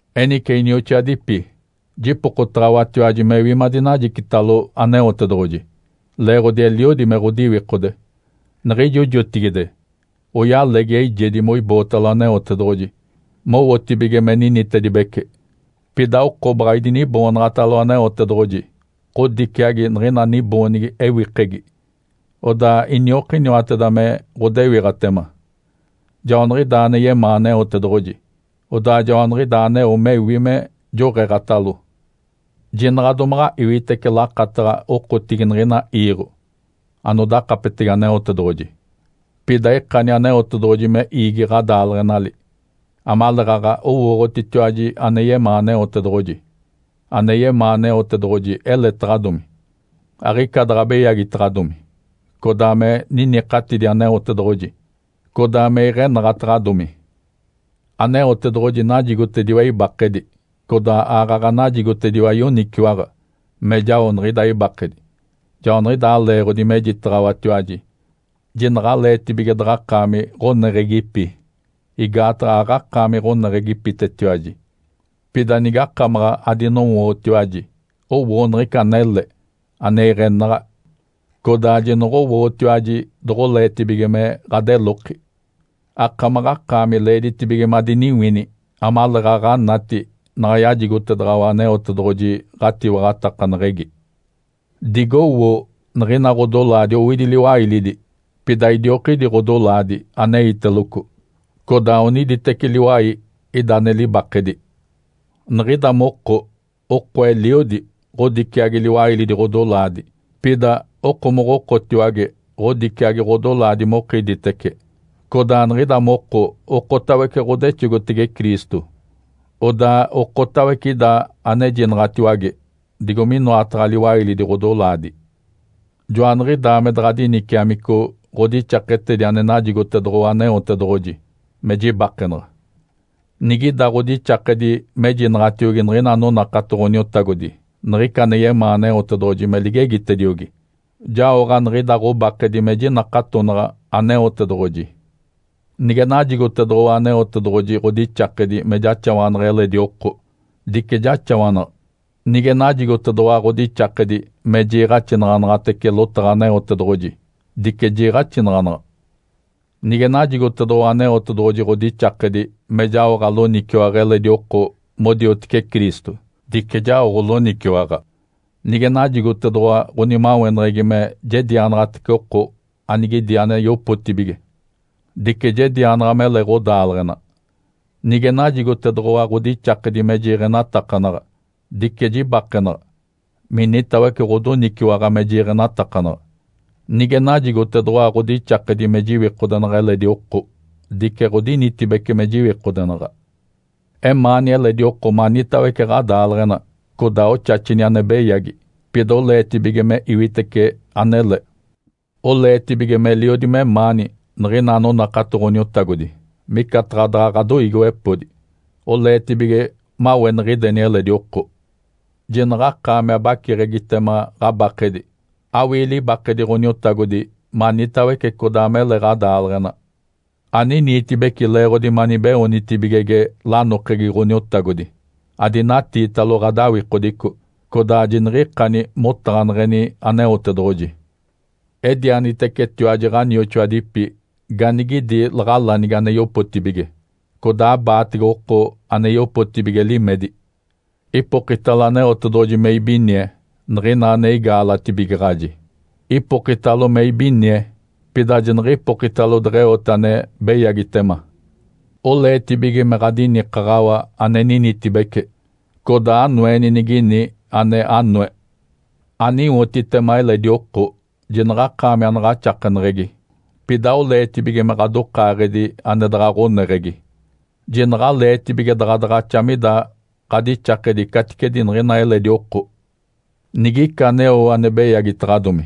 Enice inioxoadipi, jipokotaɡ̶awatiwaji mewi madinajicitalo Aneotedoɡ̶oji, leeɡ̶odi eliodi me ɡ̶odiwikode. Niɡ̶ijo jotigide oyalegi eijedi moibootalo Aneotedoɡ̶oji mowotibige me ninitedibece, pida oko baɡ̶a idiniboonaɡ̶atalo Aneotedoɡ̶oji ɡ̶odiciagi niɡ̶ina niboonigi ewikegi. Odaa iniokiniwateda me ɡ̶odewiɡ̶atema. Joaniɡ̶idaa ane yemaa Aneotedoɡ̶oji. Odaa joaniɡ̶idaa aneo mewi me joɡ̶eeɡ̶atalo. Jinaɡ̶a domaɡ̶a iwitece lakataɡ̶a okotigi niɡ̶ina iiɡ̶o anodakapetege Aneotedoɡ̶oji. Pida ikani Aneotedoɡ̶oji me iigi ɡ̶adaaleɡ̶enali, amaleeɡ̶aɡ̶a owooɡ̶otitiwaji ane yemaa Aneotedoɡ̶oji. Ane yemaa Aneotedoɡ̶oji eletaɡ̶adomi, aɡ̶icaadaɡ̶a beyagitaɡ̶adomi, codaa me ninikatidi Aneotedoɡ̶oji, codaa me iɡ̶enaɡ̶ataɡ̶adomi. Aneotedoɡ̶oji najigotediwa ibakedi, codaa aaɡ̶aɡ̶a najigotediwa yoniciwaɡ̶a me jao niɡ̶ida ibakedi. Joaniɡ̶idaa leeɡ̶odi mejitaɡ̶awatiwaji, jinaɡ̶aleetibige daɡ̶akaami ɡ̶oneɡ̶egipi, igaataɡ̶a aɡ̶akaami ɡ̶oneɡ̶egipitetiwaji. Pida nigakamaɡ̶a adinowootiwaji, owoo niɡ̶ica anele, ane iɡ̶enaɡ̶a, codaa jinoɡ̶owootiwaji doɡ̶oleetibige me ɡ̶adeloki. Akamaɡ̶akaami leeditibige madiniwini amaleeɡ̶aɡ̶a anati naɡ̶a yajigotedaɡ̶awa Aneotedoɡ̶oji ɡ̶atiwaɡ̶atakaneɡ̶egi. Digowoo niɡ̶ina ɡ̶odolaadi owidi liwailidi, pida idiokidi ɡ̶odolaadi aneiteloco. Codaa oniditeci liwai ida ane libakedi. Niɡ̶ida moko, oko eliodi, ɡ̶odiciagi liwailidi ɡ̶odolaadi. Pida okomoɡ̶okotiwage ɡ̶odiciagi ɡ̶odolaadi mokiditece. Codaa niɡ̶ida moko okotawece ɡ̶odexogotege Cristo. Odaa okotawece ida anejinaɡ̶atiwage digo minoataɡ̶a liwailidi ɡ̶odolaadi. Joaniɡ̶idaa me daɡ̶a diniciamico ɡ̶odixaketedi ane najigotedoɡ̶owa Aneotedoɡ̶oji me jibakenaɡ̶a. Nigida ɡ̶odixakedi mejinaɡ̶atiogi niɡ̶ina anonakato Ǥoniotagodi niɡ̶ica ane yemaa Aneotedoɡ̶oji me ligegitediogi, jaoɡ̶a niɡ̶ida ɡ̶obakedi me jinakatonaɡ̶a Aneotedoɡ̶oji. Nige najigotedoɡ̶owa Aneotedoɡ̶oji ɡ̶odixakedi me jaxawanaɡ̶a eledi oko, dice jaxawanaɡ̶a. Nige najigotedoɡ̶owa ɡ̶odixakedi me jiiɡ̶axinaɡ̶anaɡ̶atece lotaɡ̶a Aneotedoɡ̶oji, dice jiiɡ̶axinaɡ̶anaɡ̶a. Nige najigotedoɡ̶owa Aneotedoɡ̶oji ɡ̶odixakedi me jaoɡ̶a loniciwaɡ̶a eledi oko modiotece Cristo, dice jaoɡ̶o loniciwaɡ̶a. Nige najigotedoɡ̶owa ɡ̶onimaweneɡ̶egi me jedianaɡ̶atece oko anigidi ane yopotibige, dice jedianaɡ̶a, mele ɡ̶odaaleɡ̶ena. Nige najigotedoɡ̶owa ɡ̶odixakedi me jiiɡ̶enatakanaɡ̶a, dice jibakenaɡ̶a minitawece ɡ̶odoniciwaɡ̶a me jiiɡ̶enatakanaɡ̶a. Nige najigotedoɡ̶owa ɡ̶odixakedi me jiwikodenaɡ̶a eledi oko, dice ɡ̶odinitibece me jiwikodenaɡ̶a. Emaani eledi oko manitawece ɡ̶adaaleɡ̶ena. Codaa oxaxini ane beyagi, pida oleetibige me iwitece anele. Oleetibige meliodi memaani niɡ̶ina anonakato Ǥoniotagodi micataɡ̶a daɡ̶a ɡ̶adoiigiwepodi. Oleetibige maweniɡ̶ideni eledi oko. Jinaɡ̶akaami abaciɡ̶egitema ɡ̶abakedi. Awii libakedi Ǥoniotagodi manitawece codaa mele ɡ̶adaaleɡ̶ena. Aniniitibeci leeɡ̶odi manibeoonitibigege lanokegi Ǥoniotagodi. Adinatiitalo ɡ̶adawikodico, codaa jiniɡ̶ikani motaɡ̶aneɡ̶eni Aneotedoɡ̶oji. Edianitecetiwaji ɡ̶anioxoadipi ganigidi laɡ̶alanigi ane yopotibige. Codaa abaatege oko ane yopotibige limedi. Ipokitalo Aneotedoɡ̶oji me ibinie niɡ̶ina ane igaalatibigaɡ̶aji. Ipokitalo me ibinie, pida jiniɡ̶ipokitalo deɡ̶eote ane beyagitema. Oleetibige me ɡ̶adinikaɡ̶awa ane ninitibece. Codaa anoeni nigini ane anoe. Aniwotitema eledi oko. Jinaɡ̶akaami anaɡ̶axakeneɡ̶egi, pida oleetibige me ɡ̶adokaaɡ̶edi ane daɡ̶a ɡ̶oneɡ̶egi. Jinaɡ̶aleetibige daɡ̶a daɡ̶axa mida ɡ̶adixakedi caticedi niɡ̶ina eledi oko. Nigica aneo ane beyagitaɡ̶adomi,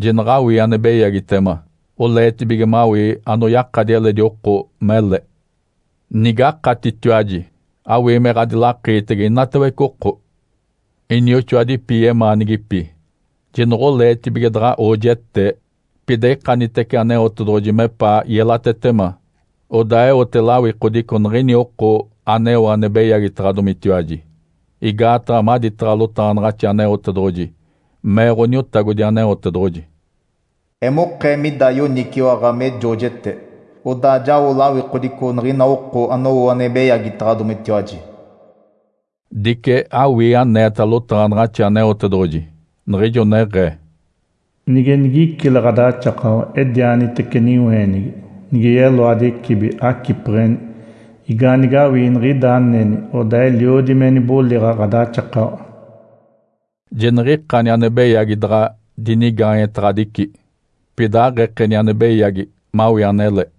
jinaɡ̶awii ane beyagitema. Oleetibige mawii anoyakadi eledi oko mele. Nigakatitiwaji, awii me ɡ̶adilakiitege inatawece oko. Inioxoadipi yemaanigipi. Jinoɡ̶oleetibige daɡ̶a oojetee. Pida ikanitece Aneotedoɡ̶oji mepaa yelatetema, odaa eote lawikodico niɡ̶ini oko aneo ane beyagitaɡ̶adomitiwaji. Igaataɡ̶a maditaɡ̶a lotaɡ̶anaɡ̶axi Aneotedoɡ̶oji mee Ǥoniotagodi Aneotedoɡ̶oji, “Emokee mida yoniciwaɡ̶a me joojete. Odaa jao lawikodico niɡ̶ina oko anowo ane beyagitaɡ̶adomitiwaji.” Dice awii aneeta lotaɡ̶anaɡ̶axi Aneotedoɡ̶oji, niɡ̶ijo neɡ̶ee, “Nige nigicile ɡ̶adaxakawa, edianitece niweenigi, nige yeloadi ecibi, acipeɡ̶eni. Igaanigawii niɡ̶ida aneni, odaa eliodi me niboliɡ̶a ɡ̶adaxakawa.” Jiniɡ̶ikani ane beyagi daɡ̶a dinigaanyetaɡ̶adici. Pida aɡ̶ekeni ane beyagi mawii anele.